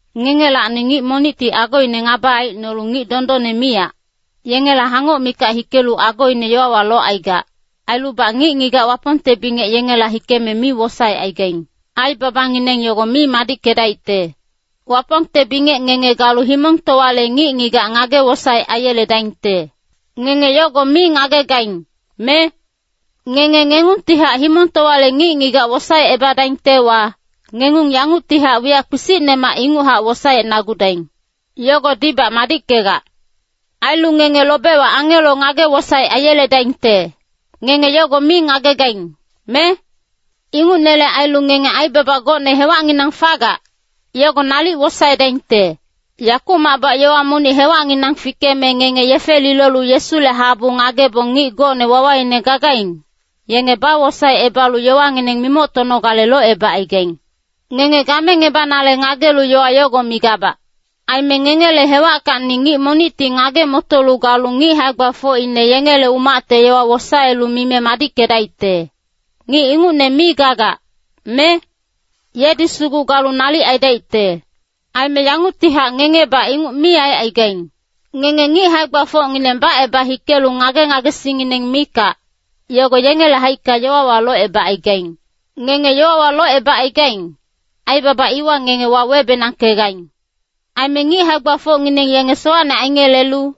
Ngengelacni ngic monicti agoine ngaba aicnolu ngic dondonne miyac, yengela hangoc mikac hikelu agoine yowawa locaigac, ailubac ngic-ngigac Wapongte bingec yengela hikeme mi wosaecaigaing. Aibabangineng yogo mi madickedaicte. Wapongte bingec ngenge galu himongtowale ngic-ngigac ngage-wosaec aiyeledaingte. Ngenge yogo mi ngagegaing, me? Ngenge ngengungtihac himongtowale ngic-ngigac wosaecebadaingtewa, ngengung yanguctihac wiyac kpisicnemac inguchac wosaecnagudaing. Yogodibac madickegac. Ailu ngenge lobewa angelo ngage-wosaec aiyeledaingte, ngenge yogo mi ngagegaing, me? Ingucnele ailu ngenge aibaba gocne hewacnginang fagac, yogo nalic wosaedaingte. Yakumacbac yowa monic hewacnginang fikeme ngenge yefe lilolu Yesule habu ngagebong ngic gocne wawaine gagaing, yenge bawosaecebalu yowangineng mimoctonogale locebacaigaing. Ngenge gamengebanale ngagelu yowa yogo migabac. Aime ngengele hewackacni ngic monicti ngage-motolu galu ngic hae-gbafocine yengele umacte yowa wosaelu mime madickedaicte, ngic ingucne mi gagac, me? Yedi sugu galu nalic aidaicte. Aime yanguctihac ngengebac inguc mi aicaigaing. Ngenge ngic hae-gbafocngineng baceba hikelu ngage-ngagesingngineng mikac, yogo yengele haicka yowawa locebacaigaing! Ngenge yowawa locebacaigaing, aibaba iwa ngenge wawebenangkegaing. Aime ngic hae-gbafocngineng yenge sowacne aingelelu,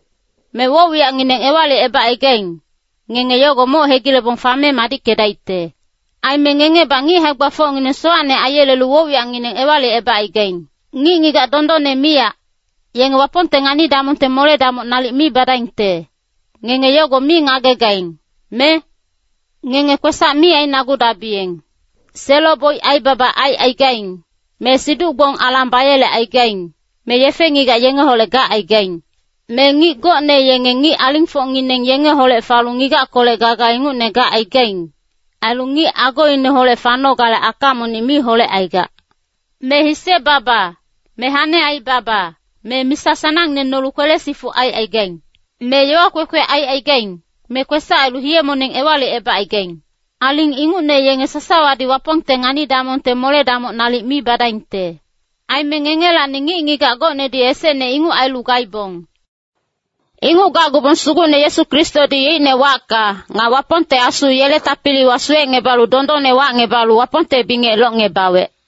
me woc-wiyacngineng ewalicebacaigaing, ngenge yogo moc hegilebong fame madickedaicte. Aime ngengebac ngic hae-gbafocngineng sowacne aiyelelu woc-wiyacngineng ewalicebacaigaing. Ngic-ngigac dondonne miyac, yenge Wapongte ngani-damongte mole-damoc nalic mi badaingte, ngenge yogo mi ngagegaing, me? Ngenge kwesac mi ainagudabiyeng. Selo-boic aibaba aicaigaing, me siduc-gbong alang bayelecaigaing, me yefe-ngigac yengeholec gacaigaing. Me ngic gocne yenge ngic alingfocngineng yengeholec falu ngigackolec gaga ingucne gacaigaing, ailu ngic agoineholec fanogale aka monic mi holecaigac. Me hise-baba, me hane aibaba, me misa sanangne nolu kwele-sifuc aicaigaing. Me yowa kwekwe aicaigaing, me kwesac ailu hiye-moneng ewalicebacaigaing. Aling ingucne yenge sasawadi Wapongte ngani-damongte mole-damoc nalic mi badaingte. Aime ngengelacni ngic-ngigac gocnedi esecne inguc ailu gaibong. Inguc gacgubong Sugucne Yesu Kristodi yeicne wacka, nga Wapongnonggengte Asu yele tapiliwa suwecngebalu dondonne wacngebalu Wapongte bingec locngebawec.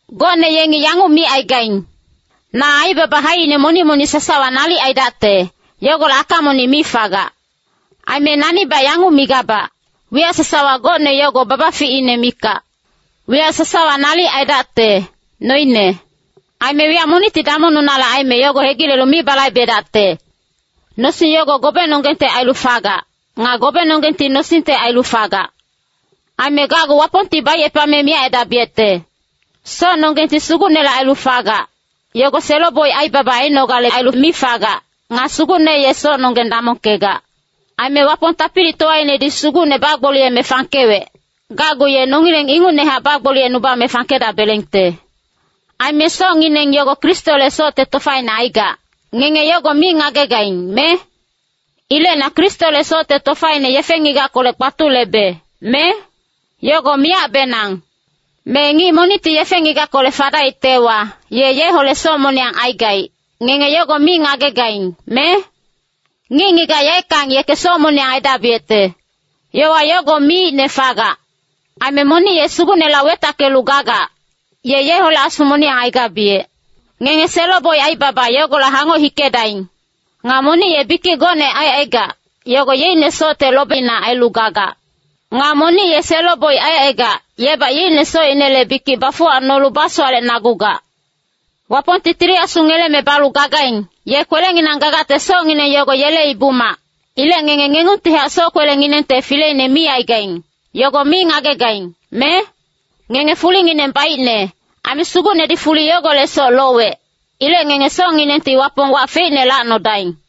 Gocne yengi yanguc micaigaing, “Na aibaba haicine monic-monic sasawa nalic aidacte, yogolec aka monic mi fagac.” Aime nanibac yanguc migabac, “Wiyac sasawa gocne yogo babaficine mikac. Wiyac sasawa nalic aidacte, noine. Aime wiyac monicti damongnunale aime yogo hegilelu mi balaibedacte.” Nosing yogo gobenonggengte ailu fagac. Nga gobenonggengti nosingte ailu fagac. Aime gacgu Wapongti baicepame miyac aidabiyecte. Socnonggengti Sugucnele ailu fagac, yogo selo-boic aibaba ainogale ailu mi fagac. Nga Sugucne ye socnonggeng damongkegac. Aime Wapong tapilitowainedi Sugucne bagboliyeme fangkewec, gacgu ye nongileng ingucnehac bagboliyecnubame fangkedabelengte. Aime socngineng yogo Kristole socte tofaine aigac, ngenge yogo mi ngagegaing, me? Ilec na Kristole socte tofaine yefe-ngigackolec kpatulebe, me? Yogo miyacbenang! Me ngic monicti yefe-ngigackolec fadaictewa, ye yeholec soc moniyang aigaic, ngenge yogo mi ngagegaing, me? “Ngic-ngigac yaeckang yeke soc moniyang aidabiyecte.” Yowa yogo miicne fagac. Aime monic ye Sugucneholec wetackelu gagac, ye yeholec asu moniyang aigabiyec. Ngenge selo-boic aibaba yogolec hangoc hikedaing! Nga monic ye bikic gocne aicaigac, yogo yeicne socte lobina ailu gagac. Nga monic ye selo-boic aicaigac, yebac yeicne socinele bikic bafuwacnolu basowalecnagugac. Wapongti Tili Asu ngeleme balu gagaing, ye kwelenginang gagacte, socngineng yogo yele ibu-mac. Ilec ngenge ngengungtihac soc-kwelenginengte fileine mi aigaing, yogo mi ngagegaing, me? Ngenge fulingineng baicne, aime Sugucnedi fuli yogolecsoc lowec. Ilec ngenge socnginengti Wapong wac feicne lacnodaing.